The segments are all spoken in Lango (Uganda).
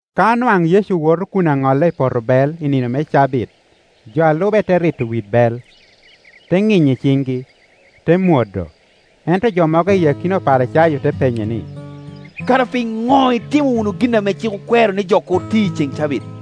Ka nwaŋ Yecu woto kun aŋolle i poto bel i nino me cabit, jo a lube te rito wit bel, te ŋinyo i ciŋgi, te mwodo. Ento jo mogo i akina Oparicayo te penyo ni, “Kara piŋo itimo wunu gin ame cik okwero ni jo kur ti i ceŋ cabit?”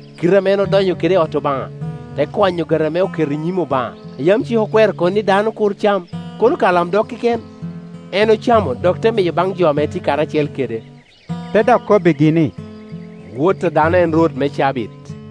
Kite ame en odonyo kede i ot Obaŋa, te kwanyo ogati ame oketo i nyim Obaŋa, a yam cik okwero ni dano kur cam, kono ka olamdog keken? En ocamo dok te miyo baŋ jo ame tye karacel kede.” Te dok kobbigi ni, “Wot a dano en Rwot me cabit.”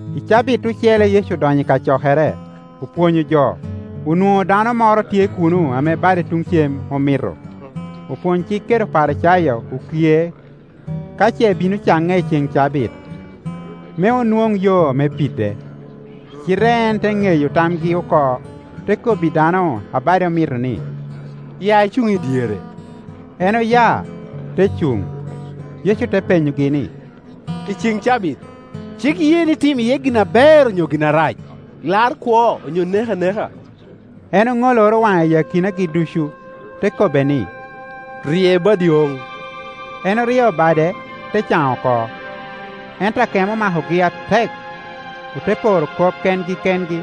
I cabit ocele Yecu odonyo i kacokere, opwonyo jo; onwoŋo dano moro tye kuno ame bade tuŋ cem omito. Opwony-cik kede Oparicayo okie ka ce bino caŋe i ceŋ cabit, me onwoŋ yo me pide. Cite en te ŋeyo tamgi oko, te kobbi dano a bade omito ni, “Ya icuŋ i dyere.” En oya, te cuŋ. Yecu te penyogi ni, “I cen cabit, cik ye ni tim iye gin aber onyo gin arac, lar kwo onyo nek aneka?” En oŋoloro waŋe i akinagi ducu, te kobbe ni, “Rye badi oŋ.” En oryeo bade, te can oko. Ento akemo omakogi atek, ote poro kop kengi kengi,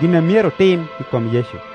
gin a myero otim i kom Yecu.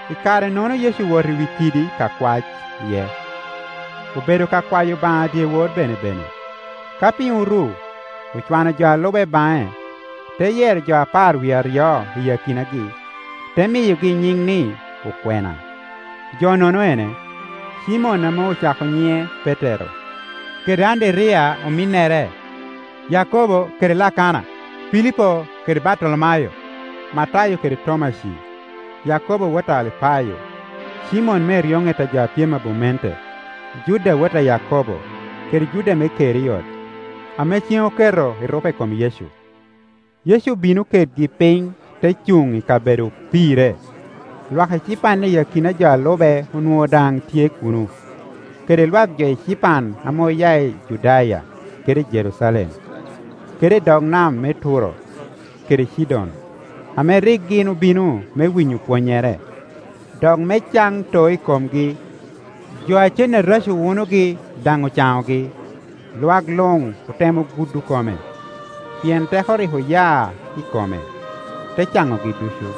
I kare-nono Yecu owoto i wi kidi ka kwac iye; obedo ka kwayo Obaŋa dyewor benebene. Ka piny oru, ocwano jo a lube baŋe, te yero jo apar wie aryo iyi akinagi, te miyogi nyiŋ ni, okwena. Jo-nono ene: Cimon ame ocako nyiŋe Petero, kede Anderiya ominnere, Yakobo kede Lakana, Pilipo kede Bartolomayo. Matayo kede Tomaci, Yakobo wot a Alipayo, Cimon me eryoŋet a jo a pyem i abumente. Juda wot a Yakobo, kede Juda me Keriot, ame ceŋ oketo erupe i kom Yecu. Yecu obino kedgi piny te cuŋ i kabedo opirre, lwak ecipan i akina jo a lube onwoŋo daŋ tye kuno, kede lwak jo ecipan ame oya i Judaya kede i Jerucalem, kede i dog nam me Turo kede Cidon, ame rik gin obino me winyo pwonnyere, dok me can too i komgi. Jo a cen areco wunogi daŋ ocaŋogi. Lwak luŋ otemo gudo kome, pien teko rik oya i kome, te canogi ducu.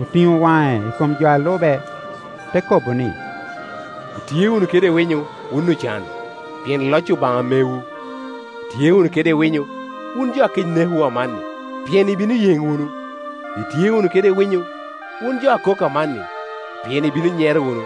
Otiŋo waŋe i kom jo a lube, te kobo ni, “Itye wunu kede winyo, wun ocan, pien loc Obaŋa mewu. “Itye wunu kede winyo, wun jo a kec nekowu amanni, pien ibino yeŋ wunu. “Itye wunu kede winyo, wun jo a kok amanni, pien ibino nyero wunu.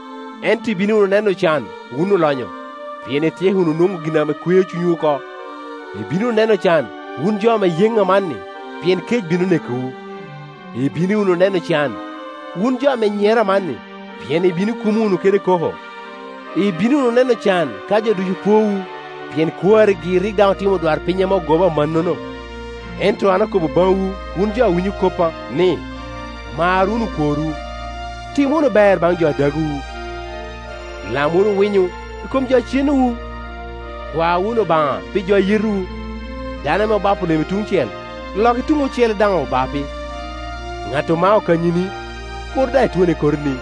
“Ento ibino wunu neno can, wun olonyo, pien ityeko wunu nwoŋo gin a kweo cunywu oko. “Ibino wunu neno can, wun jo ame yeŋ amanni, pien kec bino nekowu. “Ibino wunu neno can, wun jo ame nyero amanni, pien ibino kumo wunu kede koko. “Ibino wunu neno can ka jo ducu pwoowu, pien kwarigi rik daŋ otimo odwarpiny ame ogoba amannono. “Ento an akobo baŋwu, wun jo a winyo koppa, ni, Mar wunu okworwu, tim wunu ber baŋ jo a dagwu, lam wunu winyo i kom jo a cenowu, kwa wunu Obaŋa pi jo a yetowu. Dano ame obapo lemi tuŋ cel, lokke tuŋ ocele daŋ obapi; ŋat omao kanyini, kur daŋ itwonne kotini.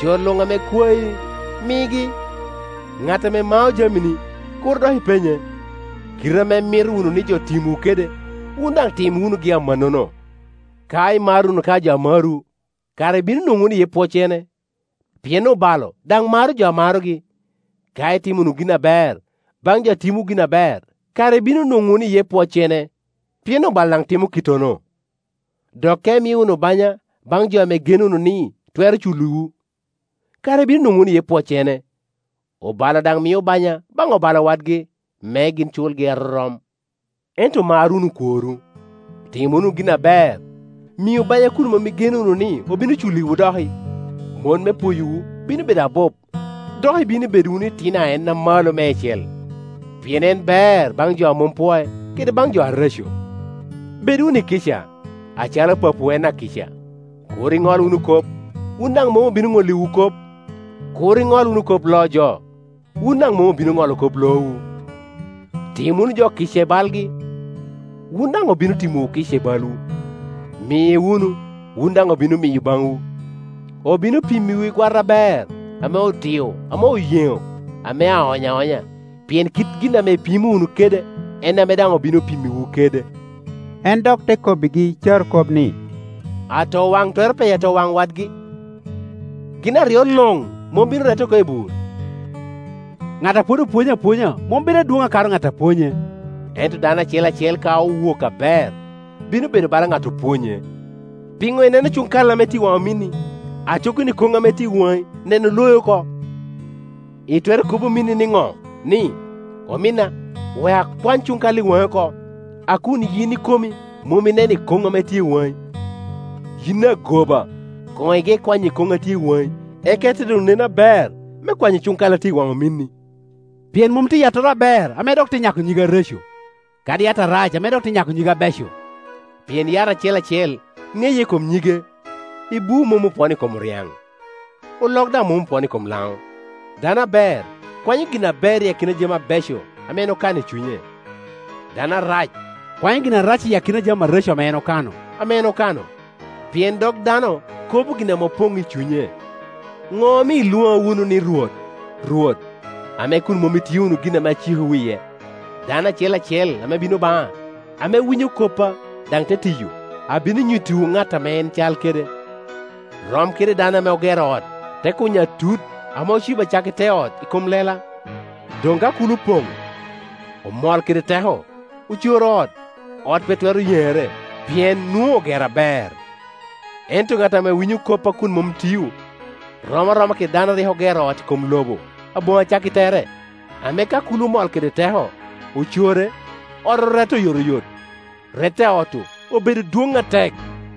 Jo luŋ ame kwai, migi, ŋat ame mao jamini, kur dok ipenye. Kite ame imito wunu ni jo timwu kede, wun daŋ tim wunugi amannono. “Ka imaro wunu ka jo a marowu, kara ibino nwoŋo wunu iye pwoccene? Pien obalo daŋ maro jo a marogi. Ka itimo wunu gin aber baŋ jo a timowu gin aber, kala ibino nwoŋo wunu iye pwoccene? Pien obalo daŋ timo kittono. Dok ka imio wunu banya baŋ jo ame igeno wunu ni twero culliwu, kara ibino nwoŋo wunu iye pwoccene? Obalo daŋ mio banya baŋ obalo wadgi, me gin culgi arorom. Ento mar wunu okworwu, tim wunu gin aber, miu banya kun mom igeno wunu ni obino culliwu doki. Mot me pwoyowu bino bedo abup, dok ibino bedo wunu itino a En Amalo Meicel; pien en ber baŋ jo a mom pwoc, kede baŋ jo areco. Bed wunu i kica, acalo Papawu en akica. “Kur iŋol wunu kop, wun daŋ mom obino ŋolliwu kop. Kur iŋol wunu kop loo jo, wun daŋ mom obino Ŋolo kop loowu. Tim wunu jo kica i balgi, wun daŋ obino timowu kica i balwu. Mi wunu, wun daŋ obino miyo baŋwu. Obino pimmiwu i gwata aber, ame odio, ame oyeŋo, ame aony aonya. Pien kit gin ame ipimo wunu kede, en ame daŋ obino pimmiwu kede.” En dok te kobbigi carokop ni, “Atowaŋ twero peyo atowaŋ wadgi? Gin aryo luŋ mom bino rette oko i bur? Ŋat a pwod opwonyo apwonya mom bedo adwoŋ akato ŋat a pwonye; ento dano acel acel ka owok aber, bino bedo bala ŋat opwonye. Piŋo ineno cuŋ kal ame tye i waŋ ominni, aco kono ikoŋ a tye i waŋ i ikomi neno loi oko? Itwero kobo ominni niŋo ni, ‘Ominna, wek akwany cuŋ kal i wani-ni oko,’ a kun yin ikomi mom ineno ikoŋ a tye i waŋi? Yin agoba, koŋ ige kwanyo ikoŋ a tye i waŋi, eka ite doŋ neno aber me kwanyo cuŋ kai a tye i waŋ ominni. “Pien mom tye yattoro aber ame dok te nyako nyige areco, kadi yat arac ame dok te nyako nyige abeco; pien yat acel acel ŋeye i kom nyige. Ibuu mom opwono i kom oryaŋ, olok daŋ mom opwono i kom laŋo. Dano aber kwanyo gin aber i akina jami abeco ame en okano i cunye, dano arac kwanyo gin arac i akina jami areco ame en okano; pien dog dano kobo gin ame opoŋ i cunye. “Ŋo omio ilwoŋa wunu ni, ‘Rwot, Rwot,’ ame kun mom itio wunu gin ame acikowu iye? Dano acel acel ame bino baŋa, ame winyo koppa, daŋ te tiyo, abino nyuttiwu ŋat ame en cal kede. Rom kede dano ame ogero ot, te kunyo atut, ame ocibo acakki te ot i kom lela. Doŋ ka kulo opoŋ, omol kede teko, ocoro ot, ot pe twero yeŋere, pien nwoŋo ogero aber. Ento ŋat ame winyo koppa kun mom tio, rom aroma kede dano a rik ogero ot i kom lobo aboŋo acakki tere, ame ka kulo omol kede teko, ocore, ot orette oyotoyot; rette a ot-tu obedo dwoŋ atek.”